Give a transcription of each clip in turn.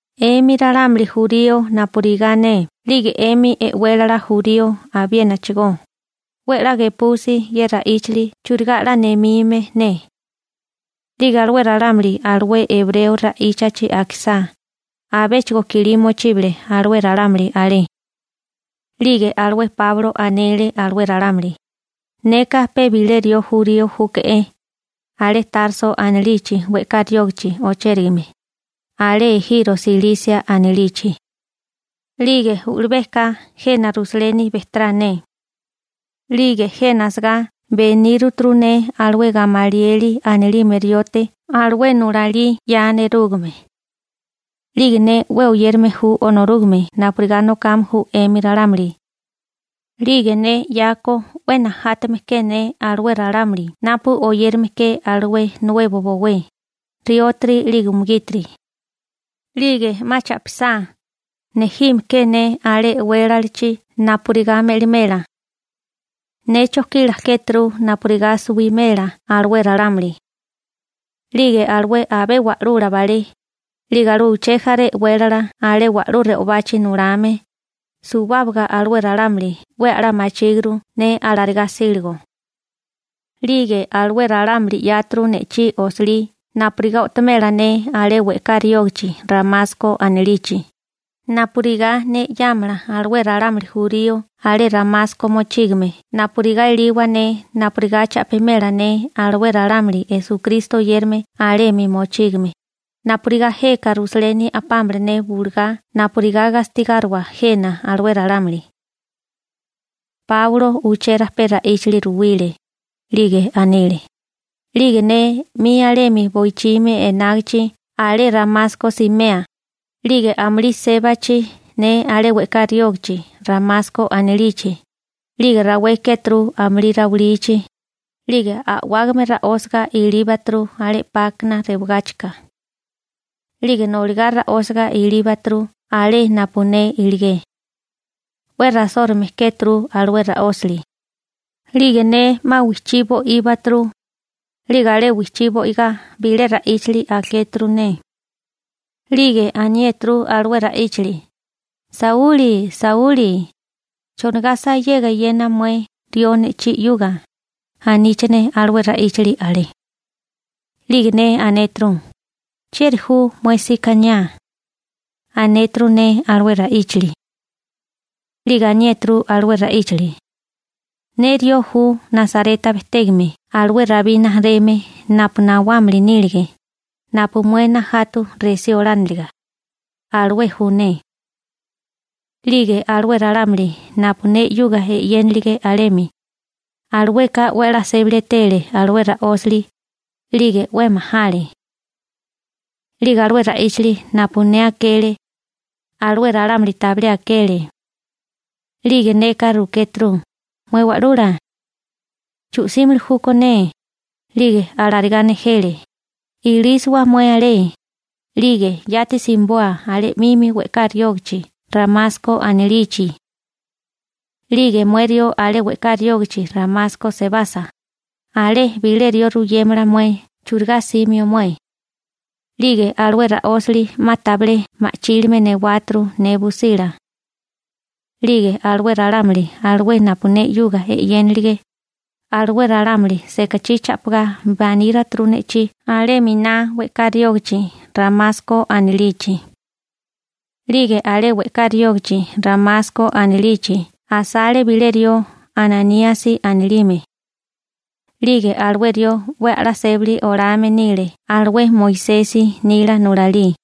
―'Emi ralámuli jurío napurigá ne 'lige 'emi e'wélala jurío abiénachigó, 'we 'la gepusi ye ra'íchili churigá 'la nemime ne. 'Lige alué ralámuli alué ebreo ra'íchachi akisá, abéchigo kilí mochíbale alué ralámuli alé. 'Lige alué Páulo anele alué ralámuli: ―Neka pe bilé rió jurío júke'é, alé Tarso anilichi we'ká riógichi ochérigame, alé ejiro Silisia anilichi. 'Lige u'lubéká jena Rusaleni bejterá ne. 'Lige jena asagá beníruturu ne alué Gamalieli anilime riote alué nulalí 'ya nerúgame. 'Lige ne 'we oyérame ju Onorúgame napurigá nokame ju 'emi ralámuli. 'Lige ne 'yako 'we najátame ke ne alué ralámuli napu oyérame ke alué Nuebo Bowé, riótiri 'lige umugítiri. 'Lige 'ma cha'pisá, nejime ke ne alé e'wélalachi napurigá me'limela. Ne chojkila kéturu napurigá suwimela alué ralámuli. 'Lige alué abé wa'lula balé, 'lige alué uché jaré e'wélala alé wa'lú re'obachi nulame, suwábaga alué ralámuli 'we a'lá machíguru ne alarigá 'síligo. 'Lige alué ralámuli 'yáturu ne'chí osilí napurigá o'tomela ne alé we'ká riógichi Ramasko anilichi, napurigá ne 'yámala alué ralámuli jurío alé Ramasko mochígame napurigá eliwa ne napurigá cha'pimela ne alué ralámuli Esukristo oyérame alemi mochígame, napurigá jeka Rusaleni a'pámala ne bulugá napurigá gastigáriwa jena alué ralámuli. Páulo uché rajpé ra'íchili ruwile, 'lige anile: ―'Lige ne 'mi alemi bowichimi enágichi alé Ramasko simea, 'lige amulí sébachi ne alé we'ká riógichi Ramasko anilichi, 'lige rawé kéturu amulí rawilichi, 'lige a'wágame ra'ósaga ilíbaturu alé 'pákana rewagáchika. 'Lige noligá ra'ósiga ilíbaturu alé napu ne iligé. 'We rasórume kéturu alué ra'ósali. 'Lige ne 'ma wijchí bo'íbaturu. 'Lige alé wijchí bo'igá bilé ra'íchali akéturu ne. 'Lige aniéturu alué ra'íchali: «Sauli, Sauli, ¿chonigá sayega eyena mué rió ne'chí 'yuga?», aníchane alué ra'íchali alé. 'Lige ne anéturu: «¿Chieri ju mué sikaniá?», anéturu ne alué ra'íchili. 'Lige aniéturu alué ra'íchali: «Ne rió ju Nasareta bejtégame alué Rabí rijimala napu nawámili nílige, napu mué najatu resí olániliga, alué ju ne.» 'Lige alué ralámuli napu ne 'yuga e'yénilige alemi, alueka 'we a'lá sébali etele alué ra'ósali, 'lige 'we majale. 'Lige alué ra'íchili napu ne akele, alué ralámuli tabilé akele. 'Lige neka rukéturu: «Mué Wa'lula, ¿chu'símili júkó ne?» 'Lige alarigá nejele: «Ilísiwa mué alé, 'lige yati simiboa alé 'mimi we'ká riógichi Ramasko anilichi. 'Lige mué rió alé we'ká riógichi Ramasko sebasa, alé bilé rió ruyémala mué churigá 'símio mué.» 'Lige alué ra'ósili 'ma tabilé ma'chílime newáturu ne busila. 'Lige alué ralámuli alué napu ne 'yuga e'yénilige, alué ralámuli sekachí cha'pigá baníruturu ne'chí alé miná we'ká riógichi Ramasko anilichi. › 'Lige alé we'ká riógichi Ramasko anilichi asale bilé rió Ananíasi anilime. 'Lige alué rió 'we a'lá sébali olame nile alué Moisesi nila nulalí.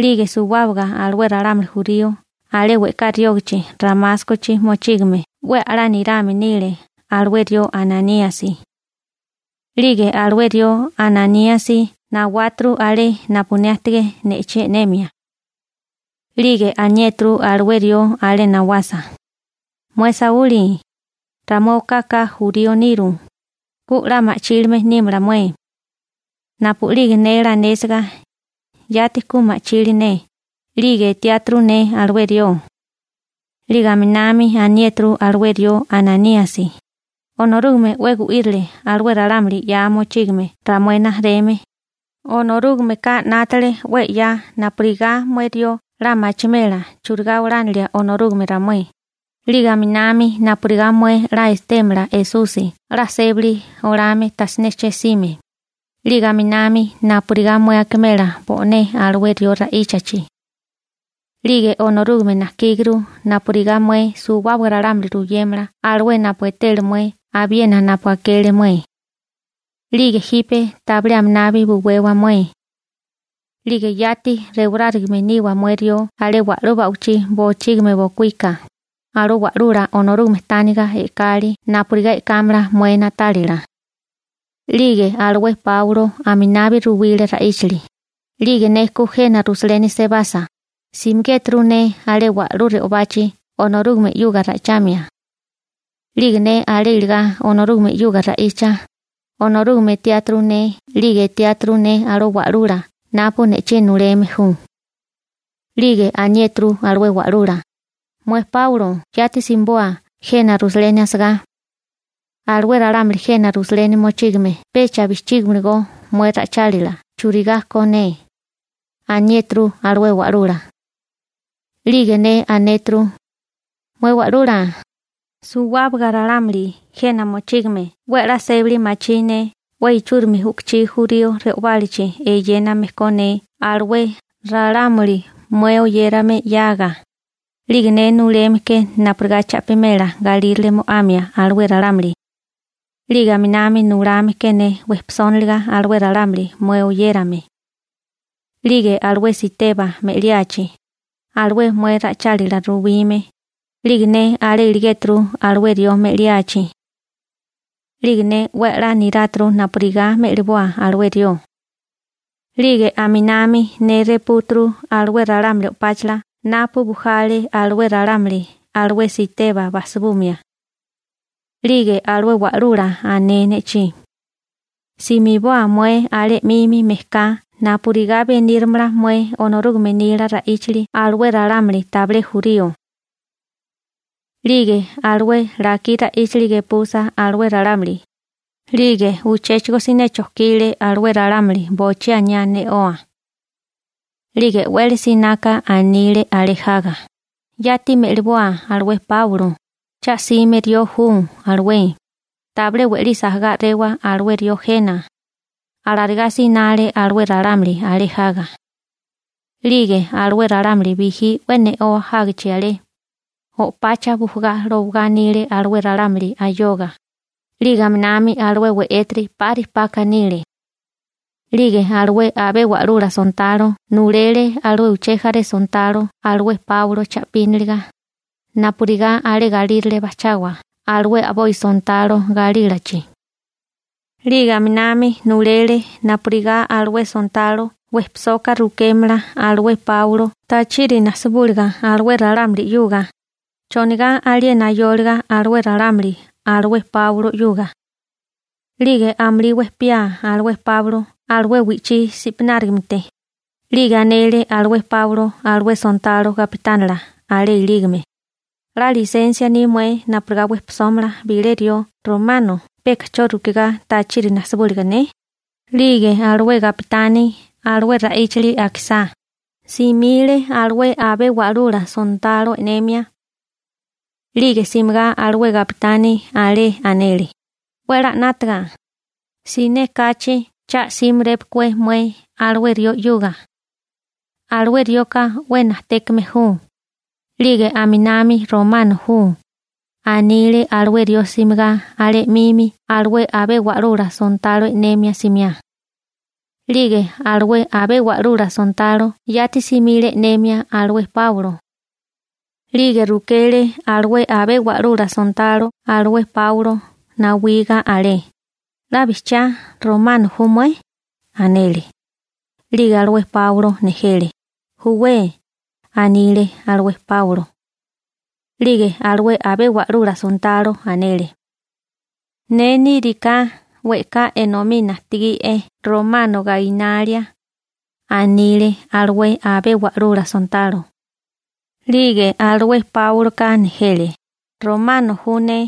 'Lige suwábaga alué ralámuli jurío alé we'ká riógichi Ramáskochi mochígame 'we a'lá nirame nile alué rió Ananíasi. 'Lige alué rió Ananíasi nawáturu alé napu ne ajtigé ne'chí e'nemia. 'Lige aniéturu alué rió alé nawasa: «Mué Sauli, ramué okaka jurío niru, ku 'la ma'chílime nímala mué.» Napu'lige ne lanésiga, yati ku ma'chili ne, 'lige etiáturu ne alué rió. 'Lige aminami aniéturu alué rió Ananíasi: «Onorúgame 'we gu'írile alué ralámuli 'ya mochígame ramué rijimala, Onorúgameka 'nátale 'we 'ya napurigá mué rió 'la machimela churigá olánilia Onorúgame ramué, 'lige aminami napurigá mué 'la etémala Esusi 'la sébali olame tajsiné che'sime, 'lige aminami napurigá mué akimela bo'né alué rió ra'íchachi. 'Lige Onorúgame najkíguru napurigá mué suwábaga ralámuli ruyémala alué napu etele mué abiena napu akele mué. 'Lige jipe tabilé aminabi buwewa mué. 'Lige yati rewarárigame niwa mué rió alé wa'lú ba'wichí bochígimi bokuíka, alué Wa'lula Onorúgame tániga e'kali napurigá e'kámala mué na'tálila.» 'Lige alué Páulo aminabi ruwile ra'íchili: ―'Lige ne ku jena Rusaleni sebasa, simigéturu ne alé wa'lú re'obachi Onorúgame 'yuga ra'ichamia. 'Lige ne alé iligá Onorúgame 'yuga ra'icha, Onorúgame etiáturu ne 'lige etiáturu ne alué Wa'lula napu ne'chí nuleme ju. › 'Lige aniéturu alué Wa'lula: «Mué Páulo yati simiboa jena Rusaleni asagá. Alué ralámuli jena Rusaleni mochígame pecha bijchígimiligó mué ra'ichálila churigá ko ne», aniéturu alué Wa'lula. 'Lige ne anéturu: «Mué Wa'lula, suwábaga ralámuli jena mochígame 'we a'lá sébali machí ne 'we ichúrimi u'kuchí jurío re'obálachi eyéname ko ne alué ralámuli mué oyérame 'yaga, 'lige ne nuleme ke napurigá cha'pimela galírale mo'amia alué ralámuli, 'lige aminami nulame ke ne wejpisóniliga alué ralámuli mué oyérame. 'Lige alué Siteba me'liachi, alué mué ra'ichálila ruwime, 'lige ne alé iligéturu alué rió me'liachi. 'Lige ne 'we a'lá niráturu napurigá me'liboa alué rió. 'Lige aminami ne repúturu alué ralámuli o'páchala napu bujale alué ralámuli alué Siteba bajsibumia.» 'Lige alué Wa'lula ané ne'chí: «Simiboa mué alé 'mimi mejká napurigá benírimala mué Onorúgame nila ra'íchali alué ralámuli tabilé jurío.» 'Lige alué lakí ra'íchali gepusa alué ralámuli, 'lige uchéchigo siné chojkile alué ralámuli bochí aniá ne'oa. 'Lige e'wele sináká anile alé jaga: ―Yati me'liboa alué Páulo, cha 'sime rió ju alué, tabilé we'lisi ajagá a'rewa alué rió jena ―alarigá sinale alué ralámuli alé jaga. 'Lige alué ralámuli bijí 'we ne'oa jágichi alé, o'pacha bujagá lowagá anile alué ralámuli ayoga, 'lige aminami alué we'étiri 'pari paka anile. 'Lige alué abé wa'lula sontalo nulele alué uché jaré sontalo alué Páulo cha'píniliga, napurigá alé galírale bajchawa alué a'boi sontalo galílachi. 'Lige aminami nulele napurigá alué sontalo wejpisoka rukémala alué Páulo tachiri najsibúliga alué ralámuli 'yuga, chonigá aliena ayóliga alué ralámuli alué Páulo 'yuga. 'Lige amulí wejpiá alué Páulo alué wi'chí sipanárigamete, 'lige anele alué Páulo alué sontalo gapitánila alé ilígame: ―¿'La lisensia ni mué napurigá wejpisómala bilé rió romano peka 'cho rukigá tachiri najsibúliga ne? 'Lige alué gapitani alué ra'íchili akisá, simile alué abé wa'lula sontalo e'nemia. 'Lige simigá alué gapitani alé anele: ―'We a'lá 'nátaga, siné kachi cha 'símirépokué mué alué rió 'yuga. Alué rioka 'we najtékame ju, 'lige aminami romano ju ―anile alué rió simigá alé 'mimi alué abé wa'lula sontalo e'nemia simiá. 'Lige alué abé wa'lula sontalo yati simile e'nemia alué Páulo. 'Lige rukele alué abé wa'lula sontalo alué Páulo nawiga alé: ―¿'La bijchiá romano ju mué? ―anele. 'Lige alué Páulo nejele: ―Júwé ―anile alué Páulo. 'Lige alué abé wa'lula sontalo, anele: ―Ne níriká we'ká enomí najtigí'é romano gainalia ―anile alué abé wa'lula sontalo. 'Lige alué Páuloka nejele: ―Romano ju ne,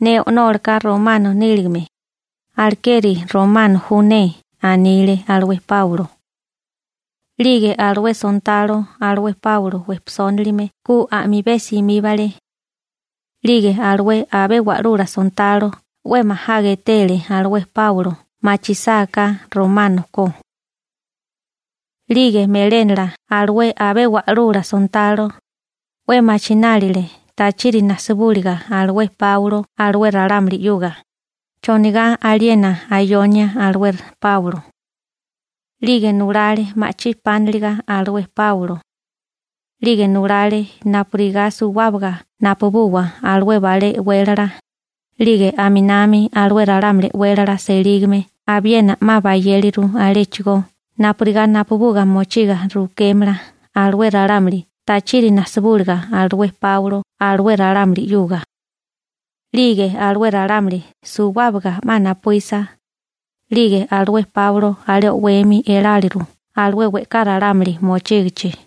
ne o'nólaka romano níligame, alekeri romano ju ne ―anile alué Páulo. 'Lige alué sontalo alué Páulo wejpisónalime ku a'mibé simíbale. 'Lige alué abé wa'lula sontalo 'we majaga etele alué Páulo machisáká romano ko. 'Lige melénala alué abé wa'lula sontalo, 'we machinálile tachiri najsibúliga alué Páulo alué ralámuli 'yuga, chonigá aliena ayonia alué Páulo. 'Lige nulale ma'chí pániliga alué Páulo. 'Lige nulale napurigá suwábaga napubuwa alué balé e'wélala, 'lige aminami alué ralámuli e'wélala selígame abiena 'ma bayéliru aléchigó napurigá napubuga mochiga rukémala alué ralámuli tachiri najsibúliga alué Páulo alué ralámuli 'yuga. 'Lige alué ralámuli suwábaga 'ma napuísa, 'lige alué Páulo alé o'wemi eláleru alué we'ká ralámuli mochígichi.